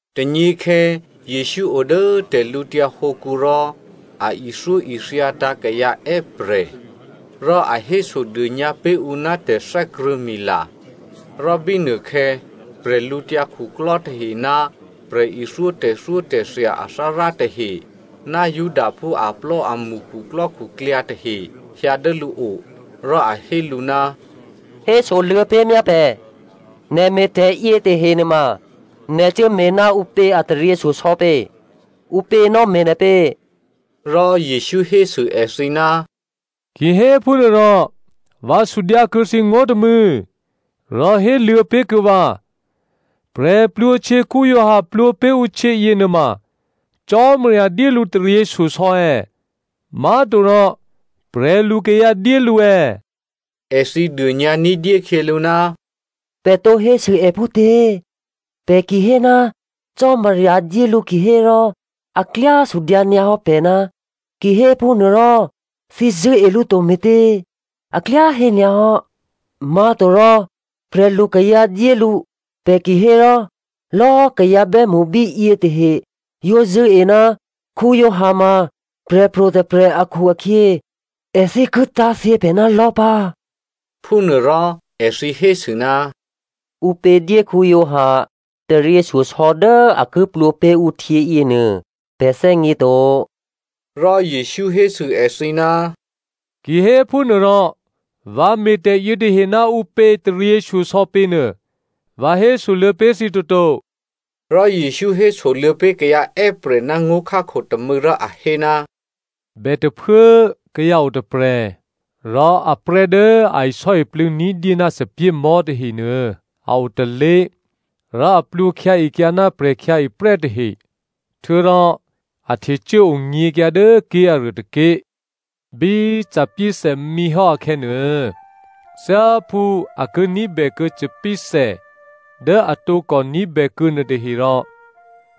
Tônyěkhè̌, Jesǔ o dố tè̤lǔtyǎ hǒkǔ rò a ithyóithyatǎ̤ kayǎ è́prè̤, rò a hésodônyǎ pé̤ ǔ ná tè̤thè́krṳ̂̌mila. Rò bínuôkhè̌, prè̤lǔtyǎ khuklò́ tahe ná prè̤ithyó tè̤thyótè̤thya athárá tahe, ná Judaphú aplò́amṳ khuklò́khuklyǎ tahe hyǎ dố lǔo. Rò a hé lǔ, “Hésoluô̌ pé̤ myá pè̤, nè̤ me̤tè̤ yětahe nuôma nè̤ cuốme̤ ná ǔpě a taryěshyosò̌ pě? Ǔpě nò̌me̤ nè̤ pě?” Rò Jesǔ hésû èthǐ, “Ki héphúnuôrò, vǎ sudyǎ kuô̌ thǐ ngó̤ tômû̌, rò héluô̌ pé̤ kuô̌ vǎ. Giovanni Baptista plwǒ pé̤ ǔ htyě yěnuôma Cò́marya dyé lǔ taryěshyosò̌ è̌? Má̤torò prè̤lukayǎ dyé lǔ è̌?” Èthǐ dônyǎ ní̤dyé khyělǔ, “Pè̤ tǒ hésû è phútě? Pè̤ ki hé, ‘Cò́marya dyé lǔ’ kihérò, a klyá sudyǎ nyǎ hò́ pè̤, ‘Kihéphúnuôrò thǐ zṳ̂́e lǔ to me̤tě?’ A klyá hé nyǎ hò́. Má̤torò, ‘Prè̤lukayǎ dyé lǔ,’ pè̤ ki hé rò lò̌꤮ kayǎ bè́mṳ bíyě tahe yǒ zṳ̂́e ná Giovanni ma prè̤pro̤ tôprè̤ akhu-akhyě, èthǐ ki tá̤thyě pè̤ ná lò̤́ pǎ.” Phúnuôrò èthǐ hésû, “Ǔpě dyé Giovanni taryěshyosò̌ dố a ki plwǒ pé̤ ǔ htyě yěnuô, pè̤ thè́gněto.” Rò Jesǔ hésû èthǐ, “Kihéphúnuôrò vǎ me̤tè̤ yětahe ná ǔpě taryěshyosò̌ pě nuô vǎ hésoluô̌ pé̤ thǐ toto.” Rò Jesǔ hésoluô̌ pé̤ kayǎ è́prè̤ ná ngó̤khákho tômû̌ rò a hé, “Bètôphuố kayǎ o tôprè̤, rò aprè́ dố a isò́iplû̌ ní̤dyé ná thòbǐthèmò̤́ tahenuô a o tôlé̤ rò a plwǒkhyǎekyǎ ná prè̤khyǎeprè́ tahe. Htuô̌rò a htecuố onyě̤kyǎ dố ké̤aruô tôké̤. Bí thòbǐthè mǐhò́ akhè̌nuô, thyáphú a ki ní̤bèkuô̌ thòbǐthè dố a tǒkò ní̤bèkuô̌ nuôtaherò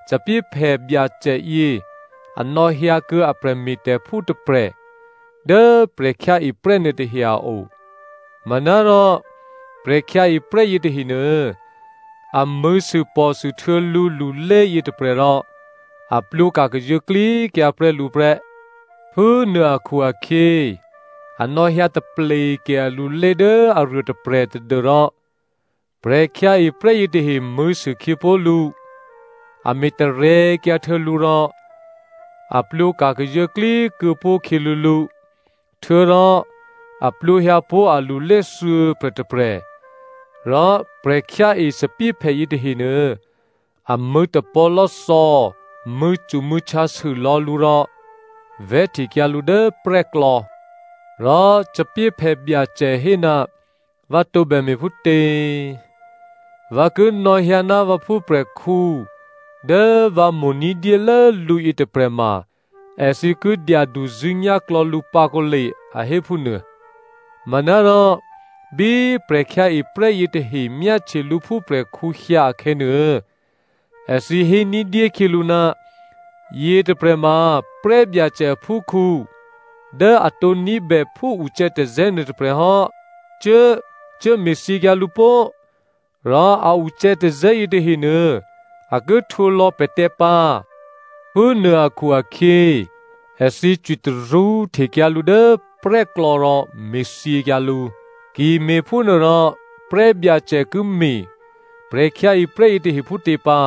thòbǐthèphè byacè yě a nò̌hyǎkuô̌ a prè̤me̤tè̤phú tôprè̤ dố prè̤khyǎeprè́ nuôtahe a o. Manárò prè̤khyǎeprè́ yětahenuô, a mṳ̂̌sûpò̤sûhtuô̌ lǔlulé yětôprè̤ rò a plwǒka̤ kazuô̌klíkyǎ prè́ lǔ prè́. Phúnuô akhu-akhyě, a nò̌hyǎ tapleke alulé dố aruô tôprè̤ tadû́rò prè̤khyǎeprè́ yětahe mṳ̂̌sû khyěpó̤ lǔ, a me̤tarè̤̌kyǎ htuô̌ lǔ rò a plwǒka̤ kazuô̌klí kuô̌pó̤khyě lǔlǔ. Htuô̌rò a plwǒhyǎ pó̤ alulé thuô̌prè̤ tôprè̤, rò prè̤khyǎe thòbǐthèphè yětahenuô, a mṳ̂̌tapò̤̌lò́thò̌, mṳ̂̌cumṳ̂̌htyǎsû lò̌ lǔ rò vè̤́htekyǎ lǔ dố prè́klò̌. “Rò thòbǐthèphè byacè hé, ‘Vǎ tǒbè me̤ phútě? Vǎ ki nò̌hyǎ ná vǎ phúprè̤khǔ dố vǎ mo̤ ní̤dyélố lǔ yětôprè̤ ma èthǐ ki dyaduzṳ̂́nyá̤ klò̌ lǔ pǎ kǒle,’ a hé phúnuô. “Manárò bí prè̤khyǎeprè́ yětahe myáhtye lǔ phúprè̤khǔ hyǎ akhè̌nuô, èthǐ hé ní̤dyé khyělǔ, ‘Yětôprè̤ ma prè́byacè aphúkhǔ dố a tǒ ní̤bè phúucè̌tazè̌ nuôtôprè̤ hò́. Cuố! Cuốme̤thyěkyǎ lǔ pó꤮! Rò a ucè̌tazè̌ yětahe nuô a ki htwǒ lò̌ pè̤tè̤ pǎ!’ Phúnuô akhu-akhyě, èthǐ cwitarṳ́ htekyǎ lǔ dố prè́klò̌ rò me̤thyěkyǎ lǔ. “Ki me̤phúnuôrò prè́byacè ki me̤ prè̤khyǎeprè́ yětahe phútě pǎ?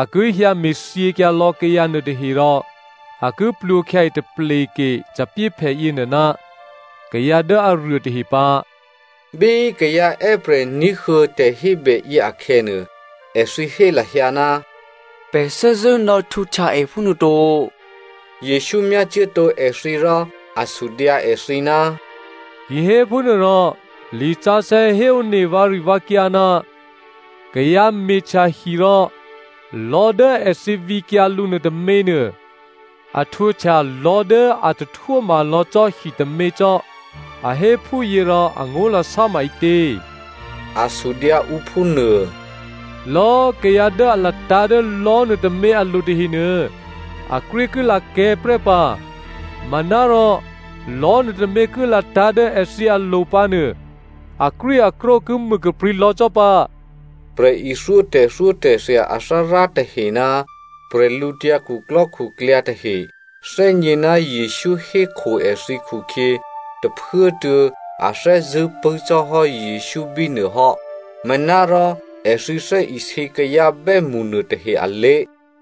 A ki hyǎ me̤thyěkyǎ lò̌꤮ kayǎ nuôtahe rò a ki plwǒkhyǎe tapleke thòbǐthèphè yěnuô ná kayǎ dố aruô tahe pǎ.” Bí kayǎ è́prè̤ ní̤huô̌ tè̤hébèyě akhè̌nuô, èthǐ hé lahyǎ, “Pè̤ thè́zṳ̂́ nò̌htwǒhtya è phúnuô to!” Jesǔ myácuốtǒ èthǐ rò a sudyǎ èthǐ, “Kihéphúnuô rò lisǎsè̌ héone vǎrivǎkyǎ, ‘Kayǎ me̤htya hi rò lò̤́ dố èthǐ vǐkyǎ lǔ nuôtôměnuô, a htwǒhtya lò̤́ dố a tahtwóma lò̌ cò́ hitômě cò́,’ a hé phúyě rò angó̤lasá ma ǐtě?” A sudyǎ ǔ phúnuô. “Lò̌꤮ kayǎ dố a latǎ̤ dố lò̤́ nuôtômě alo̤ tahenuô, akrwí ki lakè̤́ prè́ pǎ, manárò lò̤́ nuôtômě ki latǎ̤ dố èthǐ alo̤ pǎ nuô, akrwíakrwó ki mû kaprǐ̤ lò̌ cò́ pǎ.” Prè̤ithyó tè̤thyótè̤thya athárá tahe ná bwídukhu tahe thè́gně ná Jesǔ hékho èthǐ khukhyě tôphuốtuô̌ a thè́zṳ̂́ pṳ̂́ cò́ hò́ Jesǔ bínuô hò́. Manárò èthǐ thè́isě kayǎ bè́mṳ nuôtahe alé̤.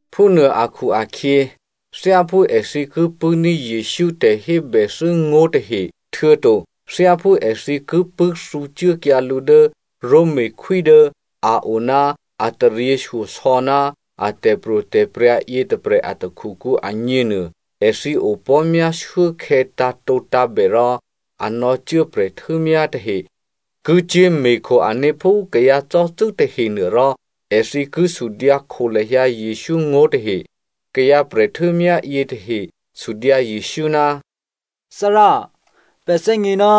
Phúnuô akhu-akhyě, thyáphú èthǐ ki pṳ̂́ní̤ Jesǔ tè̤hébèthû́ngó̤ tahe, htuô̌to thyáphú èthǐ ki pṳ̂́thǔcuốkyǎ lǔ dố Romakhwí dố a o ná a taryěshyosò̌ ná a tè̤pro̤tè̤prya̤ yětôprè̤ a takhukǔ agněnuô, èthǐ opò̤́myá shuốkhè̌ tǎ̤tǒtǎ̤bè rò a nò̌cuố prè̤htû́myá tahe ki cyé̤me̤kho ané̤ phú kayǎcò́cû́ tahenuô rò èthǐ ki sudyǎ kho lahyǎ Jesǔ ngó̤ tahe. Kayǎ prè̤htû́myá yětahe sudyǎ Jesǔ, “Thárá꤮, pè̤ thè́gně ná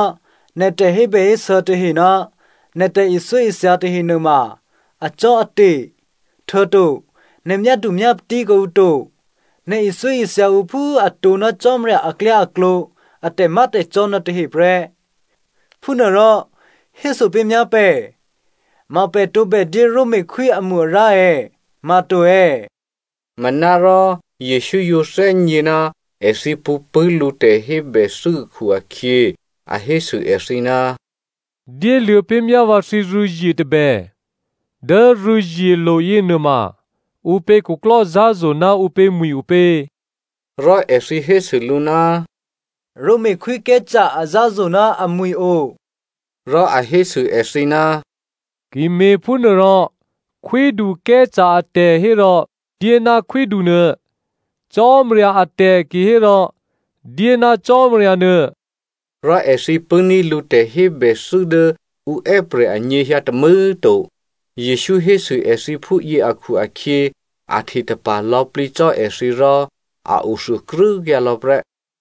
nè̤ tè̤hébèhésû̌ tahe ná nè̤ tè̤ithyóithya tahe nuôma acò́ate̤, htuô̌to nè̤ myádumyápatí kuô̌ǔ to. Nè̤ ithyóithya ǔ phú atǒ ná Cò́marya aklyáaklǒ a tè̤má̤tè̤cò́ nuôtahe prè́. Phúnuôrò héso pé̤myá pè̤, ma pè̤ tǒbè dyé Romakhwí amo-arǎ è̌? Ma to è̌?” Manárò Jesǔ yǒ thè́gně ná èthǐ pṳ̌pṳ̂́ lǔ tè̤hébèthû́ akhu-akhyě, a hésû èthǐ, “Dyéluô̌ pé̤ myá vǎ thǐrû̌zye tôbè. Dố rû̌zyelo̤ yěnuôma ǔpě khuklò́zǎ̤zo̤ ná ǔpě mwi̤ opě?” Rò èthǐ hésû lǔ, “Roma Khwí Caesare azǎ̤zo̤ ná amwi̤ o.” Rò a hésû èthǐ, “Ki me̤phúnuôrò, Khwídu Caesare atè̤ hérò dyé ná khwídunuô, Cò́marya atè̤ kihérò dyé ná Cò́marya nuô.” Rò èthǐ pṳ̂́ní̤ lǔ tè̤hébèthû́ dố ǔ è́prè̤ anyěhyǎ tômû̌꤮ to. Jesǔ hésû èthǐ phúyě akhu-akhyě a htetapa̤ lò̌plǐ cò́ èthǐ rò a o thuôkrû́kyǎ lò̌ prè́.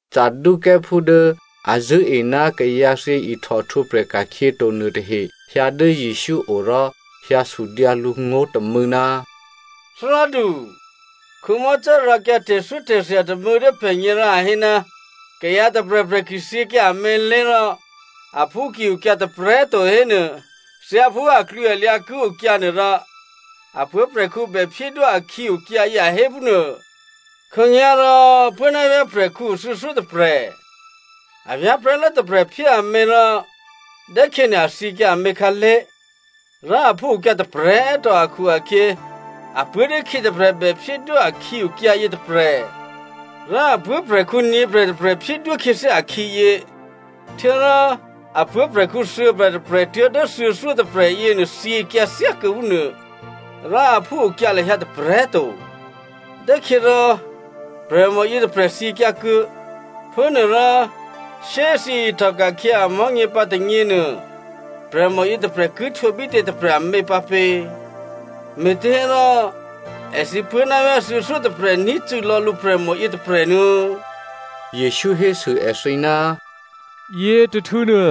Saducěophú dố a zṳ̂́e ná kayǎthyě ihtòhtwǒprè̤ ka̤khyě to nuôtahe hyǎ dố Jesǔ o rò hyǎ sudyǎ lǔ ngó̤ tômû̌, “Thárádu꤮, Mosè rǎkyǎ tè̤thyótè̤thya tômû̌ dố pè̤gně rò a hé, kayǎ tôprè̤prè̤ ki thyěkyǎ amělé̤, rò aphú ki okyǎ tôprè̤꤮ to hénuô, thyáphú aklwǐalyǎ ki okyǎ nuôrò, a puố̤prè̤khǔ bè phyédwó akhǐ okyǎyě, a hé phúnuô. Khǒnyá̤rò puố̤ ná vyá̤ prè̤khǔ o thuô̌thyótôprè̤. A vyá̤prè̤́lố tôprè̤ phyé amě rò dốkhyěnuô a thyěkyǎ amě khǎlé̤, rò aphú okyǎ tôprè̤꤮ to akhu-akhyě apuố̤ dốkhyě tôprè̤ bèphyédwó akhǐ okyǎ yětôprè̤. Rò a puố̤prè̤khǔ nyě̤prè̤tôprè̤ phyédwó khyěthyá akhǐyě. Htuô̌rò a puố̤prè̤khǔ thuô̌prè̤tôprè̤ tuố̤dố thuô̌thyótôprè̤ yěnuô thyěkyǎ thyákuô̌ phúnuô, rò aphú okyǎ lahyǎ tôprè̤꤮ to. Dốkhyě rò prè̤mò yětôprè̤ thyěkyǎ kuô̌. Phúnuôrò shyé꤮ thyěihtòka̤khyě amò̤́nyě pǎ tônyěnuô, prè̤mò yětôprè̤ ki htwǒ bítě tôprè̤ amě pǎpě? Me̤těhérò èthǐ puố̤návyá̤ thuô̌thyótôprè̤ ní̤cû̌lò̌ lǔ prè̤mò yětôprè̤ nuô̌꤮.” Jesǔ hésû èthǐ, “Yětôhtû̌nuô,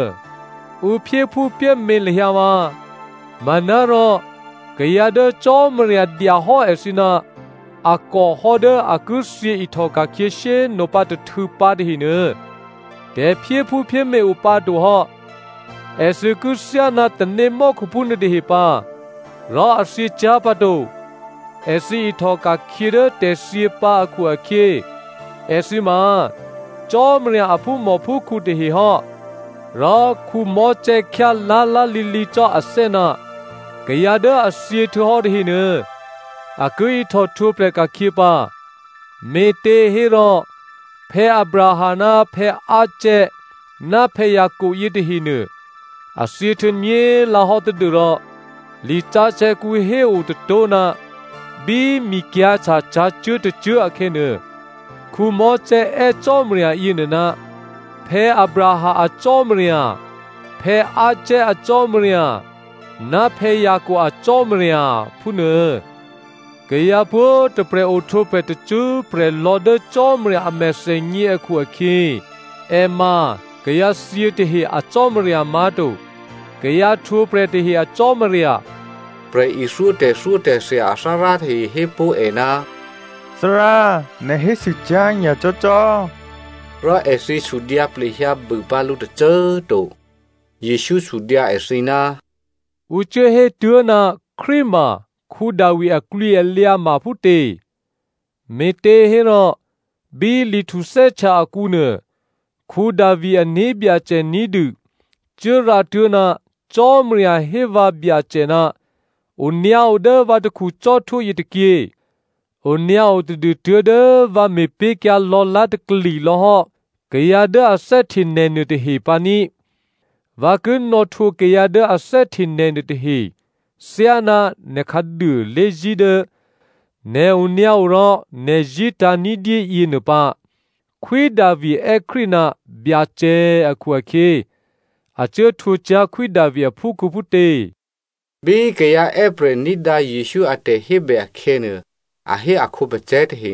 ǔ phyéphúphyémě lahyǎ vǎ. Manárò kayǎ dố Cò́marya dyahò́ èthǐ ná a kò hò́ dố a ki thyě ihtòka̤khyě shyé꤮ nopǎ tôhtû̌ pǎ tahenuô, tè̤phyéphúphyémě opǎ to hò́. Èthǐ ki thyá ná tanémò́khuphú nuôtahe pǎ rò a thyě cyá̤ pǎ to. Èthǐ ihtò ka̤khyě dố tè̤thyě pǎ akhu-akhyě, èthǐ ma Cò́marya a phúmòphúkhǔ tahe hò́. Rò Mosè khyá lá̤lá̤lǐlǐ cò́ athè́ ná kayǎ dố a thyě htuô̌hò́ tahenuô, a ki ihtò htwǒprè̤ ka̤khyě pǎ, me̤těhérò Abraham ná Isaac ná Jacob yětahenuô, a thyěhtuô̌ nyě̤lǎhò́ tadû́rò lisǎsè̌kǔ hé o tôtó̤ ná bí mikyǎ̤htya cǎcuố̤ tôcuố̤ akhè̌nuô, Mosè è́ Byacè yěnuô, ‘Abraham a Cò́marya, Isaac a Cò́marya, ná Jacob a Cò́marya,’ phúnuô. Kayǎ pwǒ̤꤮ tôprè̤ ohtwǒprè̤ tacṳ́prè̤ lò̌ dố Cò́marya a mèthènyě akhu-akhyě, è ma kayǎthyě tahe a Cò́marya má̤to, kayǎ htwǒprè̤ tahe a Cò́marya.” Prè̤ithyó tè̤thyótè̤thya athárá tahe hé pó̤ è, “Thárá꤮ nè̤ hésû cyá̤ nyacò́ cò́.” Rò èthǐ sudyǎ plehyǎ bû pǎ lǔ tôcô꤮ to. Jesǔ sudyǎ èthǐ, “Ǔ cuố hétuố̤ ná Krístu ma Davi aklwǐalyǎ ma phútě? Me̤těhérò bí Li Htuthè́htya akǔnuô, Davi ané̤byacè ní̤dû cuố rǎtuố̤, ‘Byacè hé vǎ Byacè, “Onyǎo dố vǎ takhu cò́htwó yětôkyě, onyǎo tadû tuố̤dố vǎ me̤pé̤kyǎ lò̌lá̤takli lò̌ hò́ kayǎ dố a thè́hte nè̤ nuôtahe pǎní꤮. Vǎ ki nò̌htwǒ kayǎ dố a thè́hte nè̤ nuôtahe thyáná nè̤ khǎduô lé̤zí̤ dố nè̤ onyǎo rò nè̤ zí̤tǎ̤ ní̤dyé yěnuô pǎ.”’ “Khwí Davi è́ Krístu ná ‘Byacè’ akhu-akhyě, a cuố htwǒ cyá̤ Khwí Davi aphúkhǔ phútě?” Bí kayǎ è́prè̤ ní̤dǎ Jesǔ a tè̤hébè akhè̌nuô, a hé a khǒpacè̤̌ tahe,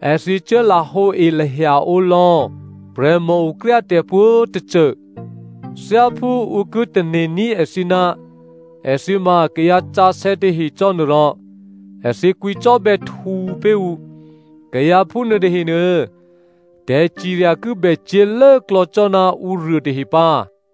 Èthǐ cuốlahǒe lahyaǒ lò̌ prè̤mòokryá tè̤ pwǒ̤꤮ tôcô. Thyáphú ǔ ki tane̤ní̤ èthǐ ná èthǐ ma kayǎsǎsè̌ tahe cò́ nuôrò, èthǐ kwǐcò́bè̌htǔ pé̤ ǔ. Kayǎ phúnuô tahenuô, tè̤cirya ki bè cyě̤ lốklò̌ cò́ ná ǔruô tahe pǎ.”